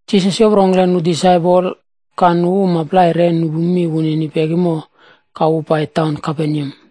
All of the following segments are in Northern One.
Jisas yoprongkle nu disaipol ka nu uma plai re nupu mi wunini pekimo ka wu pai taun Kaperneam.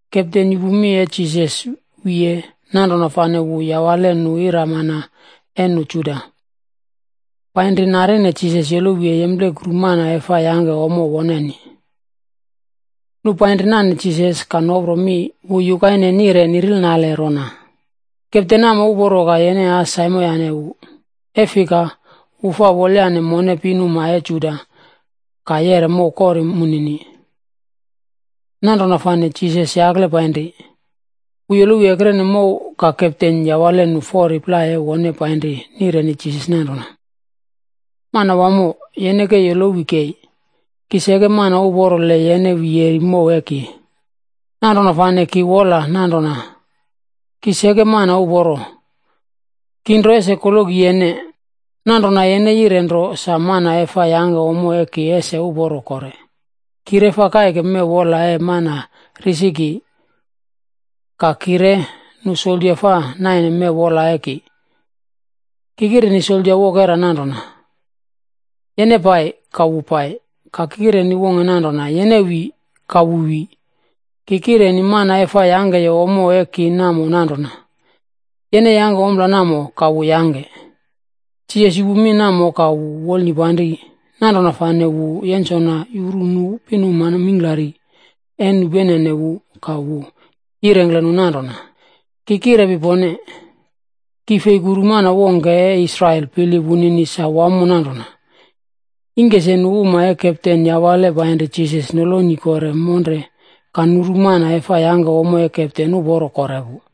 Kepten yupu mi e Jisas wiye, nanrona fane wu yawale nu iramana e nu Juda, painri narine Jisas yolowi e yemplekuru mana e fa yangke ommo woneni. Nu painri nane Jisas, ka nopro mi wu yukaine nire nirilnale rona, “Kepten namo uporo ka yene as saimoyane wu, e fika, wu fa wolyane mone pinuma e Juda ka yeꞌre mow kori munini.” Nanrona fane Jisas yakle painri. Wu yolowi ekrene mow ka kepten yawale nu fori plai e wone painri nireni Jisas nanrona, “Manawamo, yene ke yolowi kei, ki seke mana uporo le yene wi yeri mow e ki. Nanrona fane ki wola nanrona ki seke mana uporo, ki nro ese koloki yene. Nanrona yene yire nro sa mana e fa yangke ommo e ki ese uporo kore. Ki re fa kaike mew wola e mana risi ki. Ka ki re, nu soldia fa naine mew wola e ki. Ki kireni soldia wokera nanrona, ‘Yene pai,’ ka wu pai. Ki kireni wongke nanrona, ‘Yene wi,’ ka wu wi. Ki kireni mana e fa yangkeye ommo e ki namo nanrona, ‘Yene yangke ompla namo,’ ka wu yangke.” Jisas yupu mi namo ka wu wolnipanri, nanrona fane wu yensona yuru nu pinuma mingklari e nupenene wu ka wu yirengkle nu nanrona, “Ki kirepi pone, ki fei kuru mana wongke e Israel bilip wunini sa wamo nanrona.” Ingke se nu uma e kepten yawale painri Jisas, noloni kore monre ka nuru mana e fa yangke ommo e kepten uporo kore pu.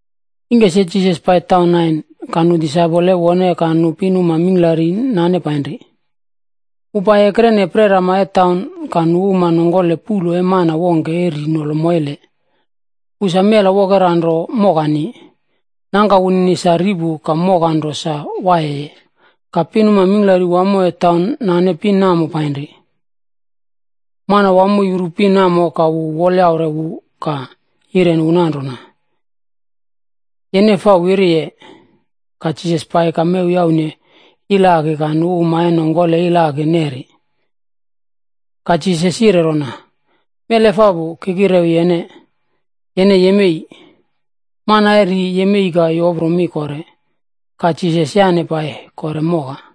Ingke se Jisas pai taun Nain, ka nu disaipol e wone ka nu pinuma mingklari nane painri. Wu pai ekrene prerama e taun,a ka nu uma nongkole puꞌlo e mana wongke e ri nolo moile. Wu sa mela wokera nro mokani. Nangka wunini sa ri pu ka moka nro sa waiye. Ka pinuma mingklari wamo e taun nane pin namo painri. Manawamo yuru pin namo, ka wu wolyaure wu ka yireni wu nanrona, “Yene fa wiriye.” Ka Jisas pai ka mew yaune iloaki ka nu uma e nongkole iloaki neri. Ka Jisas yire rona, “Mel efapu, ki kirewi yene, yene yemei!” Mana e ri, yemei ka yopro mi kore. Ka Jisas yaꞌne pai kore moka.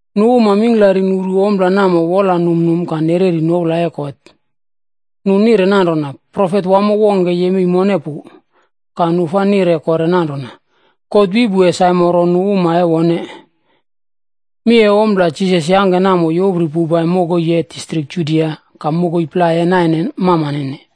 Nu uma mingklari nuru ompla namo wola numnum ka nu nereri noula e God. Nu nire nanrona, “Profet wamo wongke yemei mone pu.” Ka nu fa nire kore nanrona, “God wi pu e saimoro nu uma e wone.” Mi e ompla Jisas yangke namo yopri poupai mokoi e distrik Judia ka mokoi plai e naine mamanene.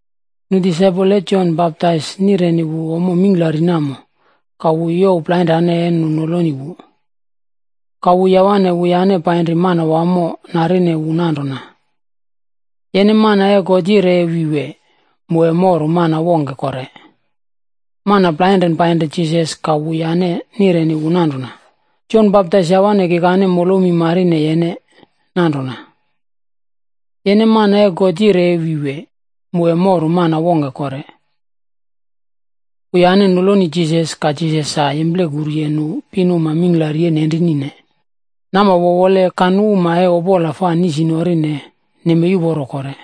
Nu disaipol e Jon Baptaisb nireni wu ommo mingklari namo, ka wu youw plainrane e nu noloni wu. Ka wu yawane wuyane painri Manawamo narine wu nanrona, “Yene mana e God yire e wi wee, mu e moru mana wongke kore?” Mana plainren painri Jisas, ka wuyane nireni wu nanrona, “Jon Baptais yawane kikane molomi marine yene nanrona, ‘Yene mana e God yire e wi wee, mu e moru mana wongke kore?’” Wuyane noloni Jisas, ka Jisas sa yemplekuruye nu pinuma mingklari e nenrinine, nama wowole ka nu uma e opola fa nisnorine, nemei uporo kore.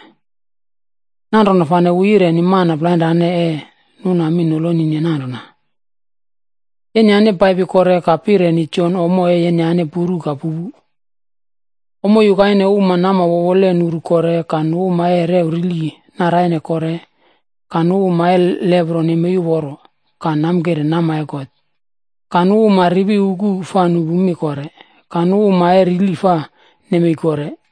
Nanrona fane wu yireni mana plainrane e nuna mi nolonine nanrona, “Yenyane paipi kore ka pireni Jon ommo e yenyane puru ka pupu. Ommo yukaine uma nama wowole nuru kore, ka nu uma e rew rili naraine kore, ka nu uma e lepro nemei uporo ka namkire nama e God,c ka nu uma ripi uku fa nupu mi kore, ka nu uma e rili fa nemei kore,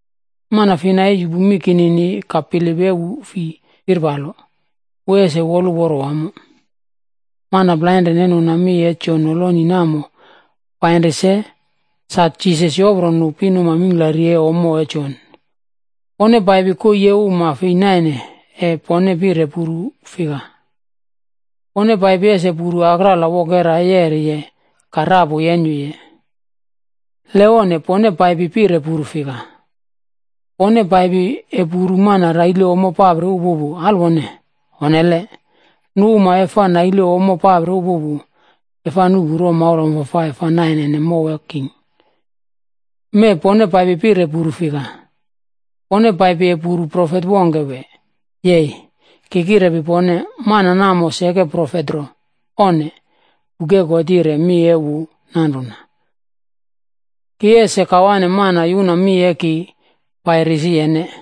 Mana fina e yupu mi kinini, ka bilip e wu fi firpalo, wu ese woluporo wamo.” Mana plainren e nuna mi e Jon noloni namo painri se, sa Jisas yopro nu pinuma mingklari e ommo e Jon, “Pone paipi koii e uma fei naine e pone pire puru fika? Pone paipi ese puru akrala wokera e yeriye ka rapu yenyuye? Le onne, pone paipi pire puru fika? Pone paipi e puru mana raile ommo papri upupu, alweone? Onnele. Nu uma e fa naile ommo papri upupu, e fa nuꞌpu romaula wamfafai fa nainene mow e king. Mee pone paipi pire puru fika? Pone paipi e puru profet wongke, wee? Yei! Ki kirepi pone, mana namo seke profet nro, onne. Buk e God yire mi e wu nanrona, ‘Ki ese kawane mana yuna mi e ki pai risi yene,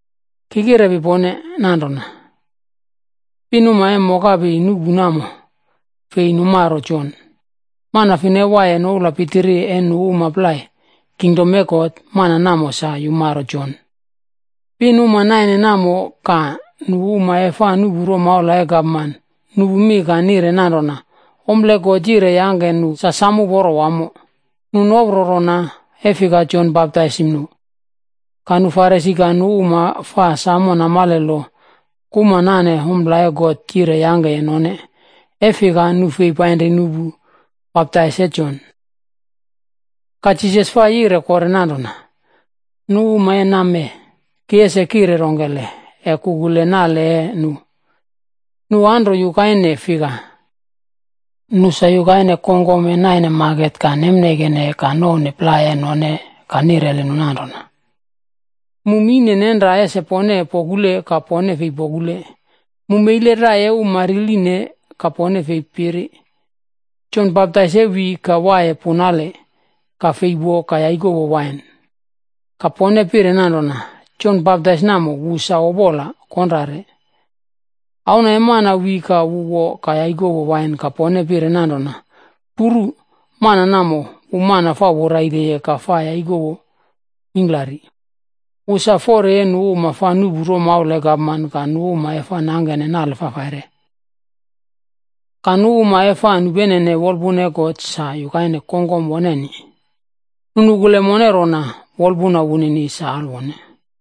Ki kirepi pone nanrona, pinuma e mokapi nuꞌpu namo, fei numaro Jon. Mana fina e waiye noula pitiri e nu uma plai, kingdom e God, mana namo sa yumaro Jon.” Pinuma naine namo ka nu uma e fa nuꞌpu romaula e gapman, nupu mi ka nire nanrona ompla e God yire yangke nu sa sam uporo wamo. Nu nopro rona, e fika Jon baptaisim nu. Ka nu Farisi ka nu uma fa samo namale lo kuma nane ompla e God yire yangkeye none, e fika nu fei painri nuꞌpu baptais e Jon. Ka Jisas fa yire kore nanrona, “Nu uma e wremee, ki ese kire rongkele e kukule nale e nu? Nu anro yukaine fika? Nu sa yukaine kongkom e naine maket ka nemneikene ka nouwne plai e none ka nireli nu nanrona, ‘Mu mine nenra ese pone pokule ka pone fei pokule, mu meile rai e uma riline, ka pone fei piri.’ “Jon Baptais e wi ka waiye punale ka fei wo ka yaikowo wain, ka pone pire nanrona, ‘Jon Baptais namo, wu sa opola konrare.’ Auna e Mana wi ka wu wo ka yaikowo wain ka pone pire nanrona, ‘Puru mana namo, wu mana fa woraileye ka fa yaikowo mingklari. Wu sa fori e nu uma e fa nuꞌpu romaula e gapman ka nu uma e fa nangke nale fafaire.’ Ka nu uma e fa nupenene wolpuna e God sa yukaine kongkom woneni, nu nukule mone rona wolpuna wunini sa alwone.”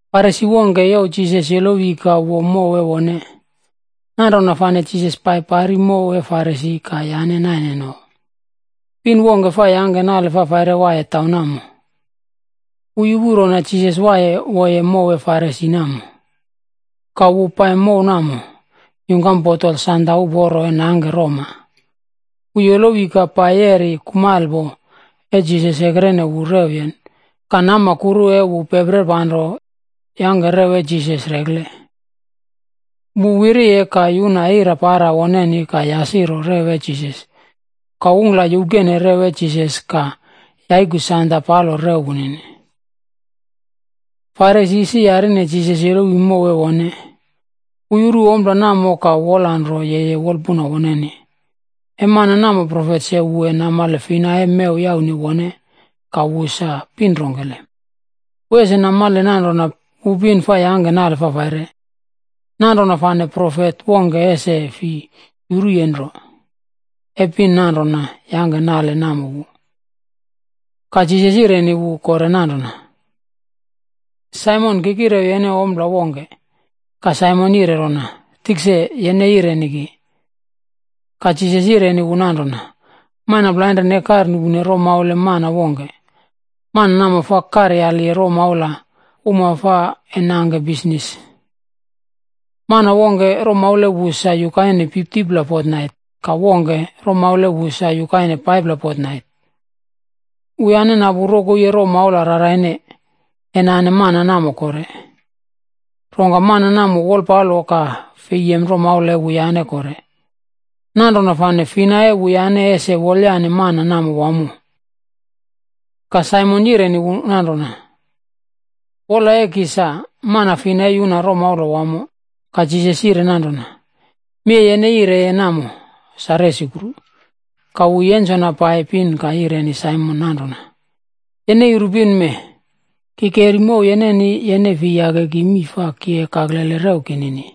Farisi wongke youw Jisas yolowi ka wo mow e wone. Nanrona fane Jisas pai pari mow e Farisi ka yane naine no. Pin wongke fa yangke nale fafaire waiye taun namo. Wu yupu rona Jisas ese pai wo mow e Farisi namo. Ka wu pai mow namo, yungkam botol sanda uporo e nangke roma. Wu yolowi ka pai yeri kumalepo e Jisas ekrene wu rewyen ka nama kuru e wu peprer panro yangke rew e Jisas rekle. Wu wiriye ka yuna ira para woneni ka yasiroye rew e Jisas, ka ungkla youkeneye rew e Jisas ka yaikuye sanda palo rew wunini. Farisi isi yarine Jisas yolowi mow e wone, wu yuru ompla namo ka wolanro yeye wolpuna woneni, “E mana namo profet se wu e namale fina e mew yaune wone ka wu sa pin rongkele. Wu ese namale nanrona, wu pin fa yangke nale fafaire. Nanrona fane profet wongke ese fi yuruye nro, e pin nanrona yangke nale namo wu.” Ka Jisas yireni wu kore nanrona, “Saimon, ki kire kirewi yene ompla wongke.” Ka Saimon yire rona, “Tikse, yene yireni ki.” Ka Jisas yireni wu nanrona, “Mana plainren e karnuꞌpu romaula e mana wongke, mana namo fa karyali romaula uma fa e nangke bisnis. Mana wongke, romaula e wu sa yukaine 50pla fotnait ka wongke, romaula e wu sa yukaine 5pla fotnait. Wuyane napu rokoi e romaula raraine, e nane mana namo kore. Rongka mana namo wolpalo ka fei yem romaula e wuyane kore. Nanrona fane fina e wuyane ese wolyane mana namo wamo?” Ka Saimon yireni wu nanrona, “Wola e ki sa, mana fina e yuna romaula wamo.” Ka Jisas yire nanrona, “Mi e yene yire namo sa resukru.” Ka wu yensona pai pin ka yireni Saimon nanrona, “Yene yuru pin mee? Ki keri mow yeneni, yene fei yake ki mii fa ki e kaklele rew kinini,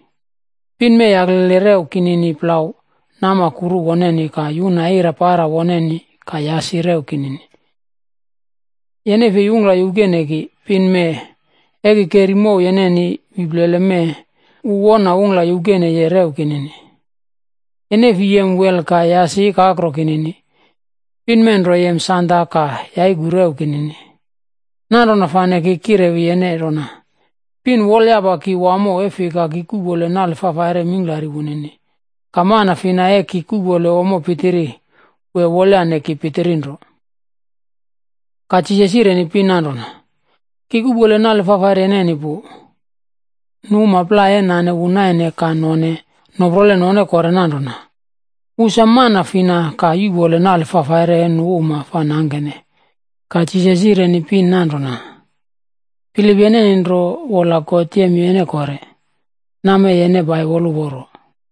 pin mee yaklele rew kinini plau nama kuru woneni ka yuna ira para woneni ka yasi rew kinini. Yene fei ungkla youkene ki, pin mee e ki keri mow yeneni wi plele mee, wu wona ungkla youkeneye rew kinini. Yene fei yem wel ka yasi ikakro kinini, pin mee nro yem sanda ka yaiku rew kinini. Nanrona fane ki kirewi yene rona, pin wolyapa ki wamo, e fika ki kuꞌpole nale fafaire mingklari wunini. Ka mana fina e ki kuꞌpole ommo pitiri, wu e wolyane ki pitiri nro.” Ka Jisas yireni pin nanrona, “Ki kuꞌpole nale fafaire yeneni pu.” Nu uma plai e nane wu naine ka none, noprole none kore nanrona, “Wu sa mana fina ka yuꞌpole nale fafaire e nu uma fa nangkene?” Ka Jisas yireni pin nanrona, “Bilip yeneni nro, wola God yem yene kore; nammee yene pai woluporo.”